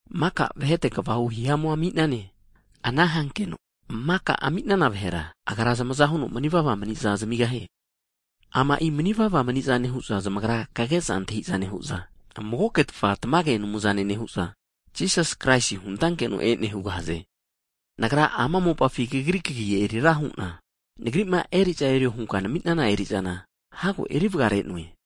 Maka vahete kvahu hihamu ami'nane, ana hankeno maka ami'nana vahera, Agra zamaza huno manivava mani'za zamigahie. Ama'i manivava mani'zane hu'za, zamagra kage'za antahi'za nehu'za, magoketfa tamage Anumzane nehu'za, Jisas Kraisi huntankeno e'ne huza keza antahiza hugahaze. Nagra ama mopafi Kagri kagi eri ra nehu'na, Nagri'ma eri'za erio hunka nami'nana eri'zana hago eri vagare'noe.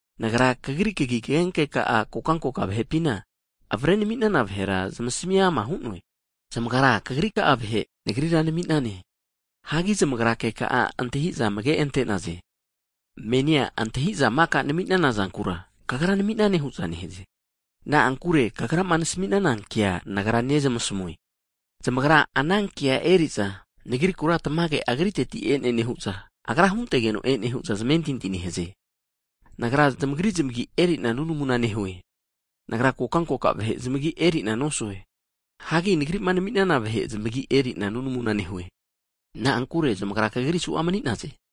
Nagra Kagri kagi kagenkeka'a kokankoka vahe'pinti'ma avare nami'nana vahera zamasmi ama hu'noe. Zamagra Kagrika'a vahe maninagenka Kagra Nagrira nami'nane. Hagi zamagra keka'a antahi'za amage ante'naze. Menina maka nami'nana zankura, Kagra nami'nane hu'za ke'za antahi'za hugahaze. Na'ankure Kagrama nasmi'nana kea Nagra zamasmi'noe. Zamagra anankea eneri'za Nagrikura tamage Agriteti e'ne nehu'za, Agra huntegeno e'ne hu'za zamentinti hu'naze. Nagra, zamagri zamagi' eri'na nunamuna nehue. Nagra kokankoka vahe zamagi' eri'na nosue, hagi Nagri'ma nami'nana vahe zamagi' eri'na nunamuna nehue. Na'ankure zamagra Kagri suza mani'naze.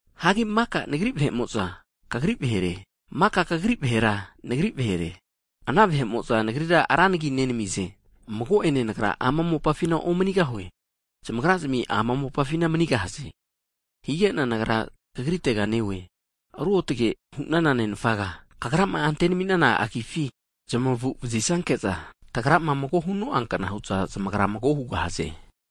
Hagi maka Nagri vahe'mo'za Kagri vahere, maka Kagri vahera Nagri vahere, ana vahe'mo'za Nagrira ra nagi nenamize. Mago'ene Nagra ama mopafina omanigahue, zamagrazmi ama mopafina manigahaze. Hige'na Nagra Kagritega neoe. Ruotge hunana Nenfaga, Kagrama ante nami'nana nagifi zamagu vazisanke'za, tagrama mago huno'ankna hu'za zamagra mago hugahaze.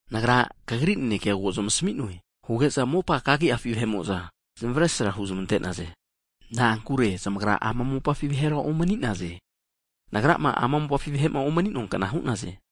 Nagra, Kagri nanekea ko zamasmi'noe, huge'za mopa kagi'afi vahe'mo'za zamesra huzmante'naze, na'ankure zamagra ama mopafi vahera omani'naze, Nagrama ama mopafi vahe'ma omani'noa kna hu'naze.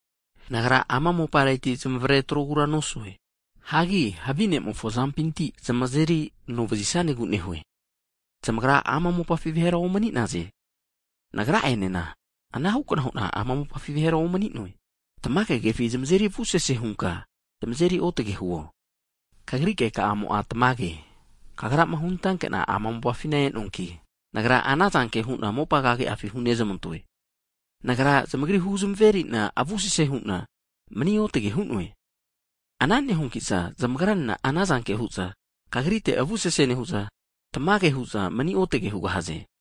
Nagra ama mopareti zamavare atrogura nosue, hagi havi ne'mofo azampinti zamazeri anovazisanegu nehue. Zamagra ama mopafi vahera omani'naze. Nagra'enena anahu hu'na, ama mopafi vahera omani'noe. Tamage kefi zamazeri avusese hunka zamazeri otage huo. Kagri keka'amo'a tamage me'ne. Kagrama hunantanke'na ama mopafina e'noankina, Nagra ana zanke hu'na mopa kagi'afi hunezmantoe. Nagra zamagri huzmeri'na avusese hu'na mani otage hu'noe, ana nehuanki'za zamagranena anazanke hu'za Kagrite avusese nehu'za, tamage hu'za mani otage hugahaze.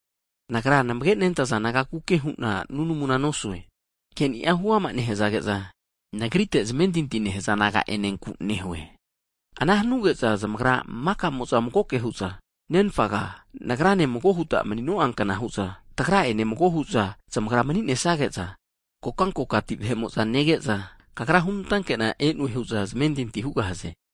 Nagrima namage nentaza disaipol nagakuke hu'na nunamuna nosue, hagi ke'ni'a huama nehzage'za, Nagrite zamentinti hanaza naga'enenku nehue, ana hanige'za zamagra maka'mo'za magoke hu'za, Nenfaga, Nagrane mago huta mani'no'a kna hu'za, Tagra ene mago hu'za zamagra mani'nesage'za, kokankokati vahe'mo'za nege'za, Kagra hunantankena e'noe hu'za zamentinti hugahaze.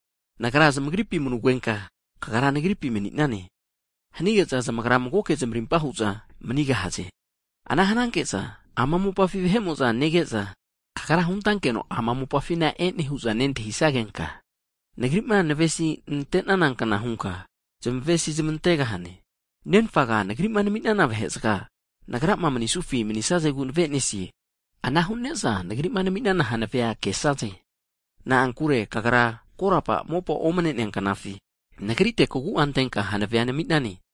Nagra zamagripi manugenka, Kagra, Nagripi mani'nane, hanige'za zamagra magoke zamarimpa hu'za manigahaze. Ana hananke'za ama mopafi vahe'mo'za nege'za, Kagra hunantankena ama mopafina e'noe hu'za keza antahiza nehanagenka, Nagri'ma kavesi nante'nana kna hunka, zamavesi nezmantane huza keza antahiza hugahaze. Nenfaga, Nagri'ma nami'nana vahe'zaga, Nagrama manisufi manisazegu nave'nesie. Ana hu'ne'za Nagri'ma nami'nana hanavea kesaze, na'ankure Kagra korapa mopa omne'nea knafi, Nagrira kavesinantenka kagu'a antenka hanavea nami'nane.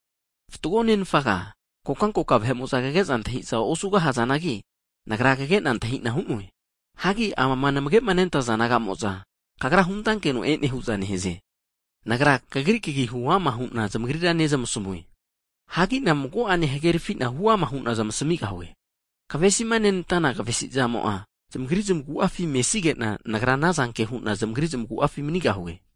Fatgo Nenfaga, kokankoka vahe'mo'za kage'za antahi'za osugahazanagi, Nagra kage'na kantahi'na hu'noe, hagi amama namage'nentaza naga'moza Kagra hunantakena e'noe hu'za keza antahiza nehaze. Nagra, Kagri kagi'a hu'ama hu'na zamagrira nezmasamue, hagi'na mago'ene hagerfi'na hu'ama hu'na zamasmigahue. Kavesima nenantana kavesi zamo'a, zamagri zamagu'afi mesige'na, Nagra anazanke hu'na zamagripi manigahue.